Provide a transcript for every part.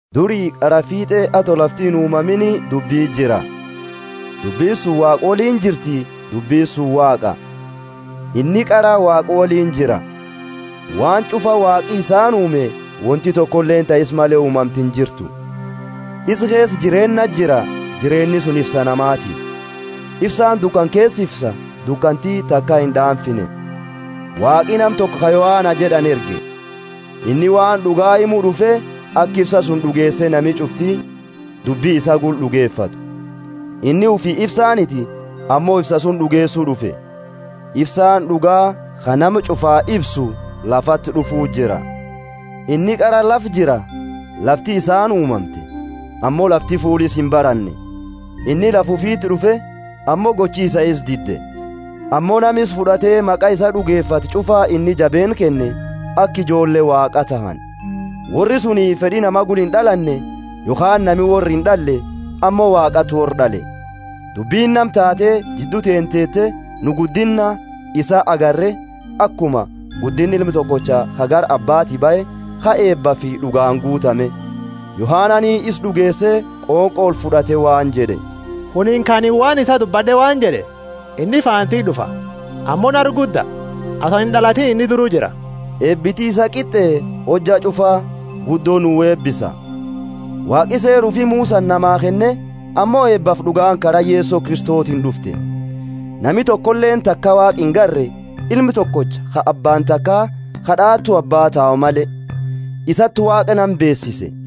Duri qara fiit'e, ato lafti inuumamiini, dubbi jira. Dubbini suni Waaqa woliini jirti, dubbini suni Waaqa. Inni qara Waaqa woliini jira. Waan ch'ufa Waaqi isaani uume, wonti tokoleeni ta isa male uumamte injirtu. Isa keesa jireenna jira, jireenni suni ifsa namaati. Ifsaani dukana keesa ifsa, dukanti taka ind'aamfine. Waaqi nama toko ka Yohana jed'ani erge. Inni waan d'uga himu d'ufe, aka ifsa suni d'ugeese nami ch'ufti dubbi isaa gula d'ugefatu. Inni ufii ifsaaniti, ammo ifsa suni d'ugeesu d'ufe. Ifsaani d'uga, ka nama ch'ufaa ifsu, lafati d'ufu jira. Inni qara lafa jira. Lafti isaani uumamte, ammo lafti fuula isaa imbaranne. Inni lafa ufiti d'ufe, ammo gochi isaa isa dide. Ammo nama isa fud'ate maqa isaa d'ugefate ch'ufa inni jabeenna kenne, aka ijoolle Waaqaa tahani. Worri suni fed'i nama gula ind'alanne, yokhaani nami worra ind'alle, ammo Waaqati worra d'ale. Dubbini nama taate, jiddu teenna teete, nu guddinna isaa agarre, akuma guddinna Ilma tokocha ka gara Abbati bahe, ka eebafi d'ugaani guutame. Yohanani isa d'ugeese, qonqo olfud'ate waan jed'e, Kunini ka anini waan isaa dubbad'e waan jed'e, Inni faana tiyya d'ufa, ammo nara gudda; ato anini ind'alatiini inni duru jira. Eebiti isaa qit'e, hojja ch'ufa guddo nu eebisa. Waaqi Seera ufii Musani namaa kenne, ammo eebafi d'ugaani kara Yeso Kristotiini d'ufte. Nami tokoleeni taka Waaqa ingarre, Ilma tokocha, ka Abbaani takaa, ka d'aatu Abbaa tau male, isati Waaqa nama beesise.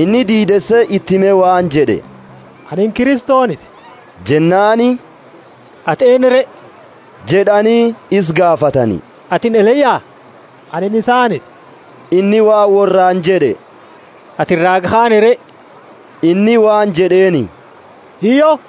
Inni diideese iti hime waan jed'e, Anini Kristoniti. Jennaani, Ati eennu re? jed'ani isa gaafatani. Atini Eliya? Inni waan worraani jed'e, Anini isaaniti. Atini raaga kaani re? Inni waan jed'eeni, Hiyyo!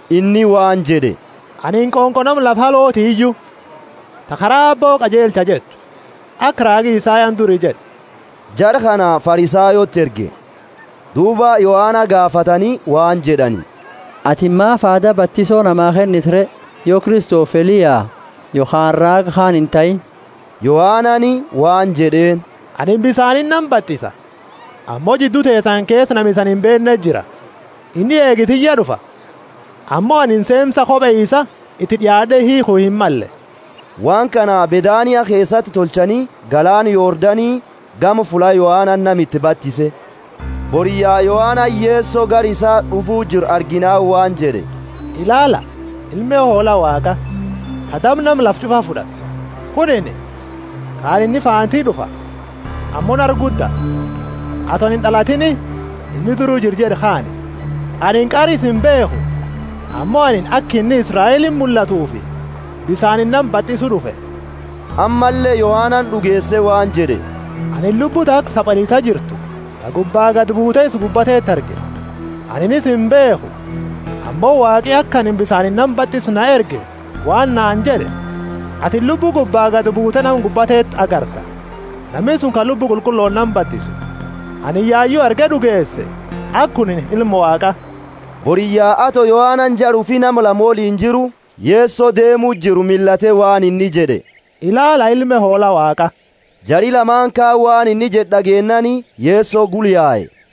Inni waan jed'e, Anini qonqo nama lafa alooti iyu, ta kara Aabbo qajeelcha jettu. Aka raagi Isayani duri jed'e. Jara kana Farisayooti erge. Duuba Yohana gaafatani, waan jed'ani, Atini maafi aada batiso namaa kennita re, yo Kristofi Eliya yokhaani raaga kaani intahiini? Yohanani waan jed'eeni, Anini bisaaniini nama batisa, ammo jiddu teesani keesa nama isani imbeenneti jira. Inni eegi tiyya d'ufa, ammo anini seemsa kope isa iti d'iaad'e hiikhu himmalle. Waan kana Bethania keesati tolchani galaana Yordani gama fulla Yohanani nama iti batise. Boriyya Yohanani Yeso gara isa d'ufu jiru arginaani waan jed'e, ilaala, ilme hoola Waaqa, ta daba nama lafa ch'ufa fud'attu. Kunini ka anini, Inni faana tiyya d'ufa, ammo nara gudda, ato anini ind'alatiini inni duru jira jed'e kaani. Anini qara isa imbeekhu, ammo anini aka inni Israeliti mullatuufi bisaaniini nama batisu d'ufe. Ammalle Yohanani d'ugeese waan jed'e, Anini Lubbu ta aka sabaliisa jirtu, ta gubba gadi buute isa gubba teetu arge. Anini isa imbeekhu, ammo Waaqi ka aka anini bisaaniini nama batisu na erge waan naani jed'e, Atini Lubbu gubba gadi buute nama gubbaa teetu agarta; nami suni ka Lubbu Qulqullooni nama batisu. Anini yayu arge d'ugeese aka kunini Ilma Waaqa. Boriyya ato Yohanani jara ufi nama lama woliini jiru; Yeso deemu jiru millate waan inni jed'e, Ilaala ilme Hoola Waaqa! Jari lamaani kaani waan inni jed'e d'ageennaani Yeso gula yae.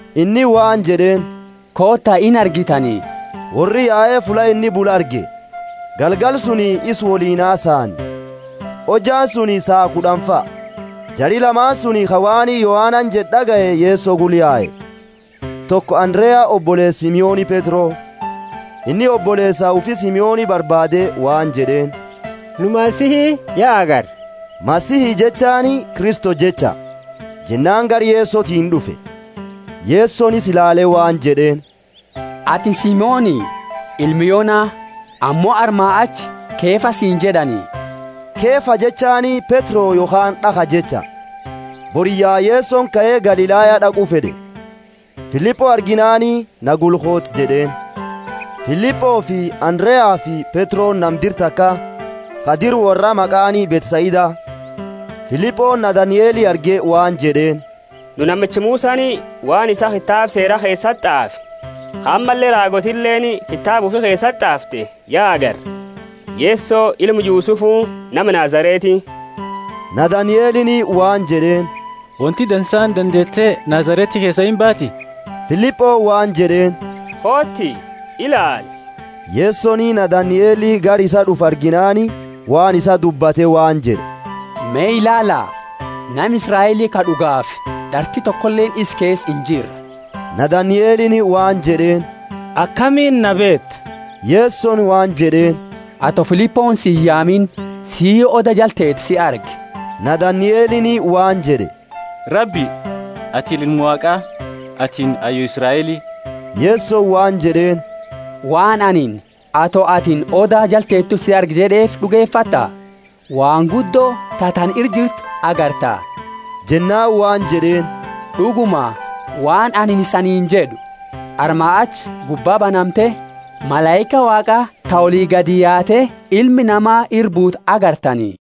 Inni waan jed'eeni, Koota, inargitani. Worri yae fulla inni bulu arge, galgala suni isa woliini hasaani. Hojjaani suni saa kud'anifa. Jari lamaani suni ka waan Yohanani jed'e, d'agaye Yeso gula yae, toko Andarea, oboleesa Simoni Petro. Inni oboleesa ufi Simoni barbaade waan jed'eeni, Nu Masihi ya agarre (Masihi jechaani Kristo jecha). Jennaani gara Yesotiini d'ufe. Yesoni isa ilaale waan jed'eeni, Atini Simoni, ilma Yona, ammo armaa achi Kefa siini jed'ani (Kefa jechaani Petro yokhaani d'akha jecha). Boriyya Yesoni kae, Galilaya d'aqu fed'e. Filipo arginaani, Na gula kooti jed'eeni. Filipofi Andareafi Petroni nama dira takaa, ka dira worraa maqaani Bethsaida. Filiponi Nathanieli arge waan jed'eeni, Nu namicha Musani waan isaa kitaaba Seera keesati t'aafe, ka ammalle raagootileeni kitaaba ufi keesati t'aafte ya agarre. Yeso ilma Yusufu nama Nazareti. Nathanielini waan jed'eeni, Wonti dansaani dandeete Nazareti keesaa imbaati? Filiponi waan jed'eeni, Kooti, ilaali. Yesoni Nathanieli gara isaa d'ufu arginaani, waan isaa dubbate waan jed'e, Me ilaala, nama Israeli ka d'ugaafi, d'arti tokoleeni isa keesa injirre. Nathanielini waan inni jed'eeni, Akamiini na beeta? Yesoni waan jed'eeni, Ato Filiponi si iyaamini sii oda jala teetu si arge. Nathanielini waan jed'e, Rabbi, atini Ilma Waaqa, atini Hayyu Israeli! Yesoni waan jed'eeni, Waan anini, Ato atini oda jala teetu si arge jed'eefi d'ugefatta? Waan guddo ta tana ira jirtu agarta. Jennaani waan jed'eeni, D'uguma, waan anini isaniini jed'u, Armaa achi gubba banamte, malaika Waaqa ta oli gadi yaate Ilma Nama ira buutu agartani.